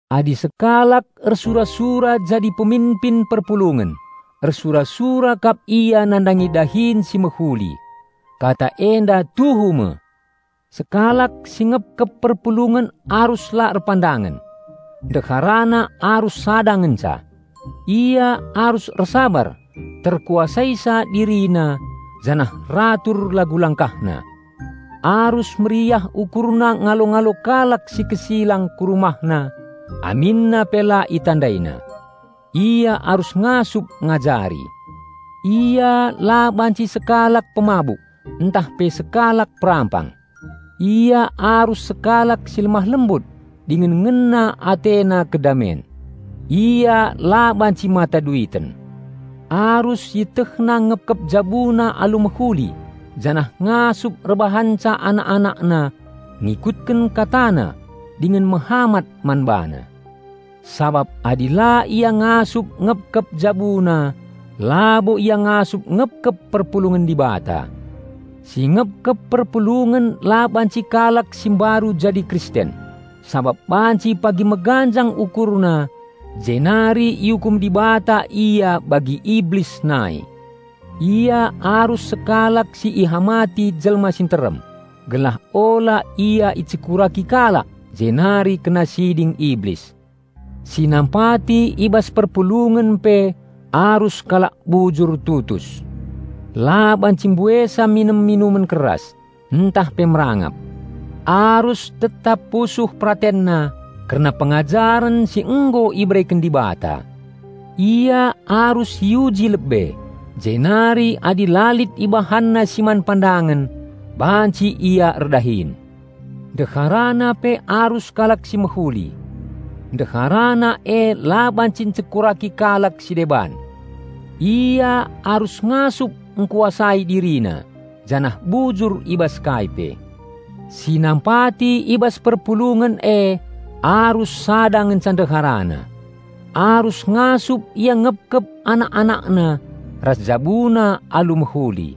Adi sekalak ersura-sura jadi peminpin perpulungen, ersura-sura kap ia nandangi dahin si mehuli. Kata enda tuhu me! Sekalak si ngepkep perpulungen arus la erpandangen. Ndeharana arus sada ngenca. Ia arus ersabar, terkuasaisa dirina janah ratur lagu langkahna. Arus meriah ukurna ngalo-ngalo kalak si kesilang ku rumahna aminna pe la itandaina. Ia arus ngasup ngajari. Ia la banci sekalak pemabuk, ntah pe sekalak perampang. Ia arus sekalak si lemah-lembut dingen ngena atena kedamen. Ia la banci mata duiten. Arus ietehna ngepkep jabuna alu mehuli janah ngasup erbahanca anak-anakna ngikutken katana dingen mehamat man bana. Sabap adi la ia ngasup ngepkep jabuna, labo ia ngasup ngepkep perpulungen Dibata. Si ngepkep perpulungen la banci kalak si mbaru jadi Kristen, sabap banci pagi meganjang ukurna jenari iukum Dibata ia bagi Iblis nai. Ia arus sekalak si ihamati jelma si nterem, gelah ula ia icekuraki kalak jenari kena siding Iblis. Si nampati i bas perpulungen pe arus kalak bujur tutus. La banci mbuesa minem minuman keras, ntah pe merangap. Arus tetap pusuh peratenna kerna pengajaren si nggo ibereken Dibata. Ia arus iuji lebe, jenari adi la lit ibahanna si man pandangen, banci ia erdahin. Ndeharana pe arus kalak si mehuli. Ndeharana e la banci ncekuraki kalak si deban. Ia arus ngasup ngkuasai dirina janah bujur i bas kai pe. Si nampati i bas perpulungen e arus sada ngenca ndeharana. Arus ngasup ia ngepkep anak-anakna ras jabuna alu mehuli.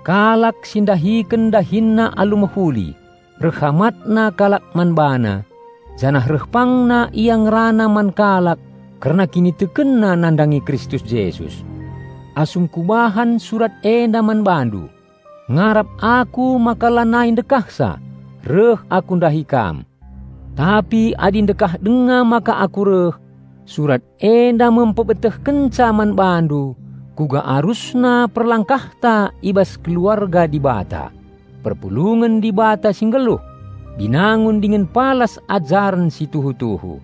Kalak si ndahiken dahinna alu mehuli, reh hamatna kalak man bana, janah reh pangna ia ngerana man kalak kerna kinitekenna nandangi Kristus Jesus. Asum kubahan surat enda man bandu, ngarap aku maka la nai ndekah sa reh aku ndahi kam. Tapi adi ndekah denga maka aku reh, surat enda me mpebetehkenca man bandu kuga arusna perlangkahta i bas keluarga Dibata, perpulungen Dibata si nggeluh, binangun dingen palas ajaren si tuhu-tuhu.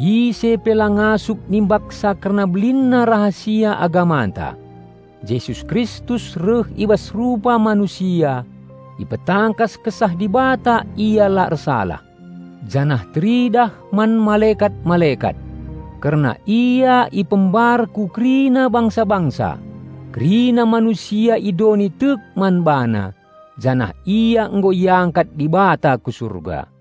Ise pe la ngasup nimbaksa kerna belinna rahasia agamanta. "Jesus Kristus reh i bas rupa manusia, ipetangkas Kesah Dibata Ia la ersalah, janah teridah man malekat-malekat. Kerna Ia ipembar ku kerina bangsa-bangsa, kerina manusia i doni tek man BaNa, janah Ia nggo iangkat Dibata ku Surga."